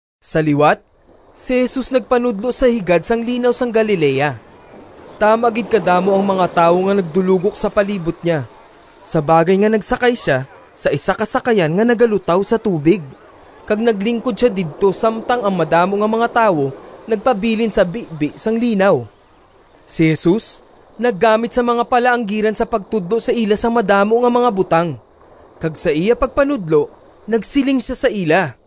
Sa liwat si Jesus nagpanudlo sa higad sang Linaw sang Galilea. Tama gid kadamo ang mga tawo nga nagdulogok sa palibot niya sa bagay nga nagsakay sia sa isa ka sakayan nga nagalutaw sa tubig kag naglingkod sia didto samtang ang madamo nga mga tawo nagpabilin sa bibi sang linaw. Si Jesus naggamit sang mga palaanggiran sa pagtudlo sa ila sang madamo nga mga butang, kag sa iya pagpanudlo nagsiling sia sa ila: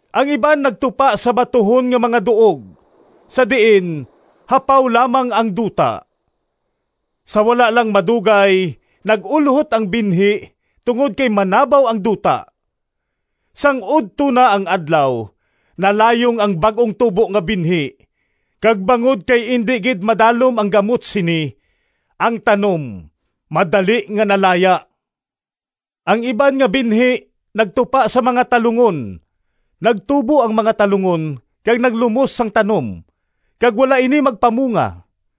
Ang iban nagtupa sa batuhon nga mga duog, sa diin hapaw lamang ang duta. Sa wala lang madugay nag-ulhot ang binhi tungod kay manabaw ang duta. Sang udto na ang adlaw nalayong ang bag-ong tubo nga binhi, kag bangod kay indi gid madalom ang gamot sini, ang tanom madali nga nalaya. Ang iban nga binhi nagtupa sa mga talungon. Nagtubo ang mga talungon kag naglumos sang tanom, kag wala ini magpamunga.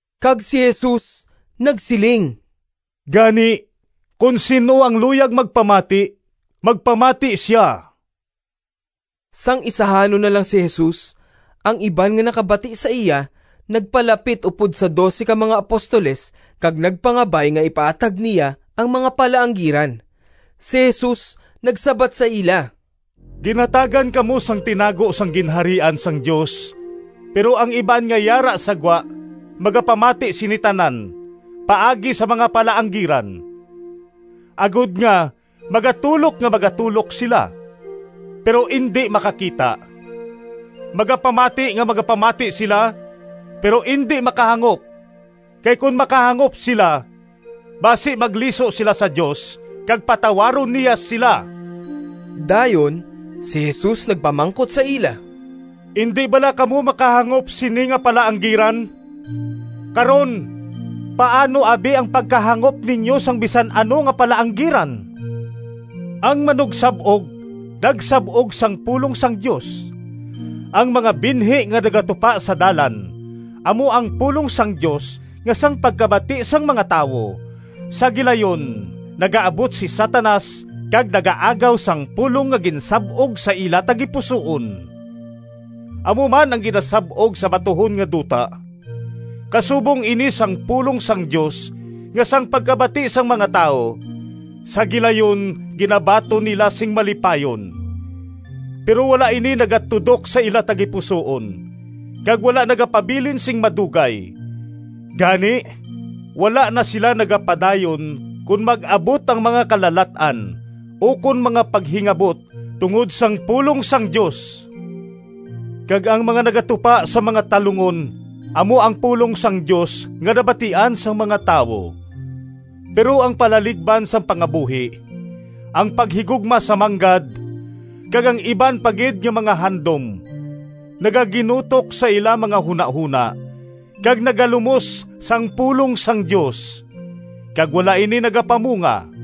Kag si Jesus nagsiling “Gani, kon sin-o ang luyag magpamati, magpamati sia!” Sang isahanon na lang si Jesus, ang iban nga nakabati sa iya nagpalapit upod sa dose ka mga apostoles kag nagpangabay nga ipaathag niya ang mga palaanggiran. Si Jesus nagsabat sa ila, “Ginhatagan kamo sang tinago sang Ginharian sang Dios, pero ang iban nga yara sa gwa magapamati sini tanan paagi sa mga palaanggiran, agod nga, ‘Magatulok nga magatulok sila, Pero indi makakita, Magapamati nga magapamati sila, Pero indi makahangop, Kay kon makahangop sila Basi magliso sila sa Dios Kag patawaron niya sila.’” Dayon si Jesus nagpamangkot sa ila, “Indi bala kamo makahangop sini nga palaanggiran? Karon, paano abi ang pagkahangop ninyo sang bisan ano nga palaanggiran? Ang manugsab-og nagsab-og sang pulong sang Dios. Ang mga binhi nga nagatupa sa dalan amo ang pulong sang Dios nga sang pagkabati sang mga tawo, sa gilayon nagaabot si Satanas kag nagaagaw sang pulong nga ginsab-og sa ila tagipusoon. Amo man ang ginasab-og sa batuhon nga duta. Kasubong ini sang pulong sang Dios nga sang pagkabati sang mga tawo, sa gilayon ginabaton nila sing malipayon. Pero wala ini nagatudok sa ila tagipusoon, kag wala nagapabilin sing madugay. Gani wala na sila nagapadayon kon mag-abot ang mga kalalat-an ukon mga paghingabot tungod sang pulong sang Dios. Kag ang mga nagatupa sa mga talungon amo ang pulong sang Dios nga nabatian sang mga tawo. Pero ang palaligban sang pangabuhi, ang paghigugma sa manggad, kag ang iban pa gid nga mga handom nagaginutok sa ila mga hunahona kag nagalumos sang pulong sang Dios, kag wala ini nagapamunga.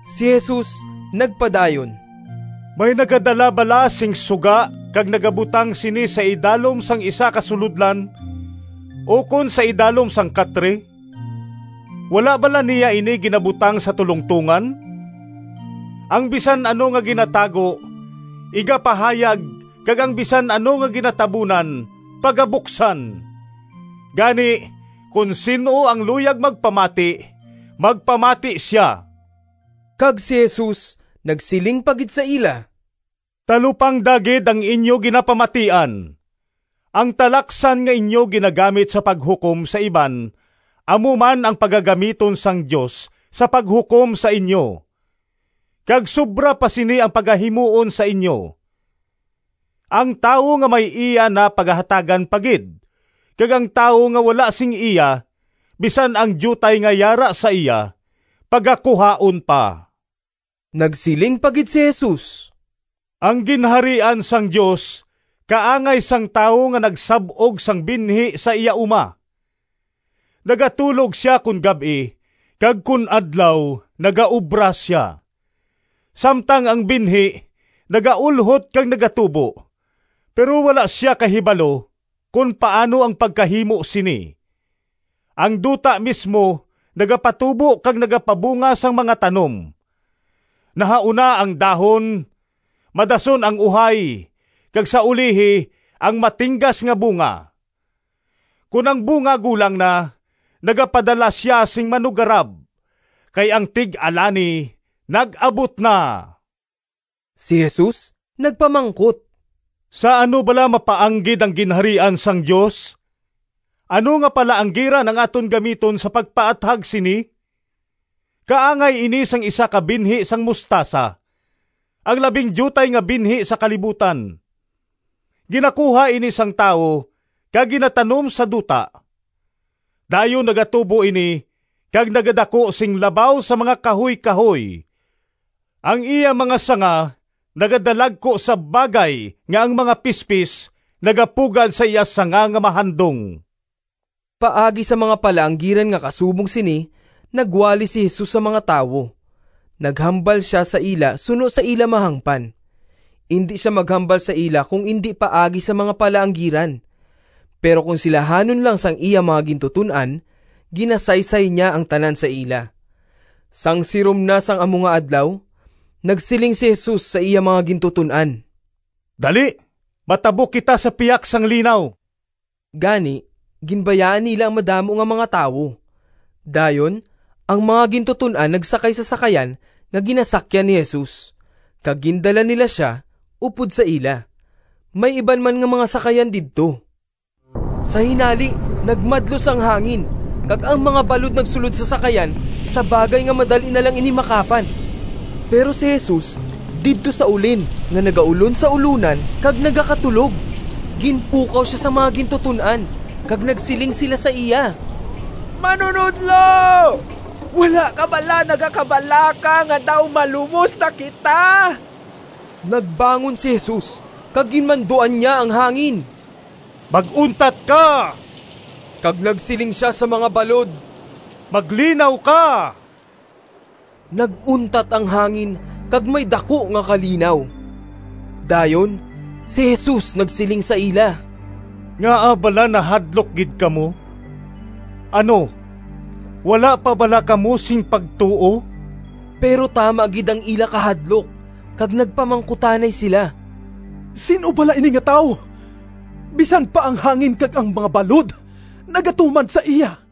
Si Jesus nagpadayon: “May nagadala bala sing suga kag nagabutang sini sa idalom sang isa ka sulodlan, ukon sa idalom sang katre? Wala bala niya ini ginabutang sa tulongtongan? Ang bisan ano nga ginatago, igapahayag kag ang bisan ano nga ginatabunan, pagabuksan. Gani, kon sin-o ang luyag magpamati, magpamati sia!” Kag si Jesus nagsiling pa gid sa ila, “Talupangda gid ang inyo ginapamatian! Ang talaksan nga inyo ginagamit sa paghukom sa iban amo man ang pagagamiton sang Dios sa paghukom sa inyo, kag sobra pa sini ang pagahimuon sa inyo. Ang tawo nga may iya na pagahatagan pa gid, kag ang tawo nga wala sing iya, bisan ang diutay nga yara sa iya pagakuhaon pa.” Nagsiling pa gid si Jesus, “Ang Ginharian sang Dios kaangay sang tawo nga nagsab-og sang binhi sa iya uma. Nagatulog sia kon gab-i, kag kon adlaw nagaobra sia, samtang ang binhi nagaulhot kag nagatubo, pero wala sia kahibalo kon paano ang pagkahimo sini. Ang duta mismo nagapatubo kag nagapabunga sang mga tanom: nahauna ang dahon, madason ang uhay, kag sa ulihi ang matinggas nga bunga. Kon ang bunga gulang na, nagapadala sia sing manuggarab, kay ang tig-alani nag-abot na.” Si Jesus nagpamangkot, “Sa ano bala mapaanggid ang Ginharian sang Dios? Ano nga palaanggiran ang aton gamiton sa pagpaathag sini? Kaangay ini sang isa ka binhi sang mostasa, ang labing diutay nga binhi sa kalibutan. Ginakuha ini sang tawo kag ginatanom sa duta. Dayon nagatubo ini kag nagadaku sing labaw sa mga kahuykahoy. Ang iya mga sanga nagadalagku sa bagay nga ang mga pispis nagapugad sa iya sanga nga mahandong.” Paagi sa mga palaanggiran nga kasubong sini, nagwali si Jesus sa mga tawo. Naghambal sia sa ila suno sa ila mahangpan. Indi sia maghambal sa ila kon indi paagi sa mga palaanggiran. Pero kon silahanon lang sang iya mga gintuton-an, ginasaysay niya ang tanan sa ila. Sang sirom na sang amo nga adlaw, nagsiling si Jesus sa iya mga gintuton-an, “Dali, matabok kita sa pihak sang linaw.” Gani ginbayaan nila ang madamo nga mga tawo. Dayon ang mga gintuton-an nagsakay sa sakayan nga ginasakyan ni Jesus, kag gindala nila sia upod sa ila. May iban man nga mga sakayan didto. Sa hinali nagmadlos ang hangin kag ang mga balod nagsulod sa sakayan sa bagay nga madali na lang ini makapan. Pero si Jesus didto sa ulin nga nagaulon sa ulonan kag nagakatulog. Ginpukaw sia sang mga gintuton-an, kag nagsiling sila sa iya, “Manunodlo, wala ka bala nagakabalaka nga daw malumos na kita?” Nagbangon si Jesus kag ginmanduan niya ang hangin, “Mag-untat ka!” kag nagsiling sia sa mga balod, “Maglinaw ka!” Nag-untat ang hangin kag may daku nga kalinaw. Dayon si Jesus nagsiling sa ila, “Ngaa bala nahadlok gid kamo? Ano, wala pa bala kamo sing pagtuo?” Pero tama gid ang ila kahadlok, kag nagpamangkutanay sila: “Sin-o bala ini nga tawo? Bisan pa ang hangin kag ang mga balod nagatuman sa iya!”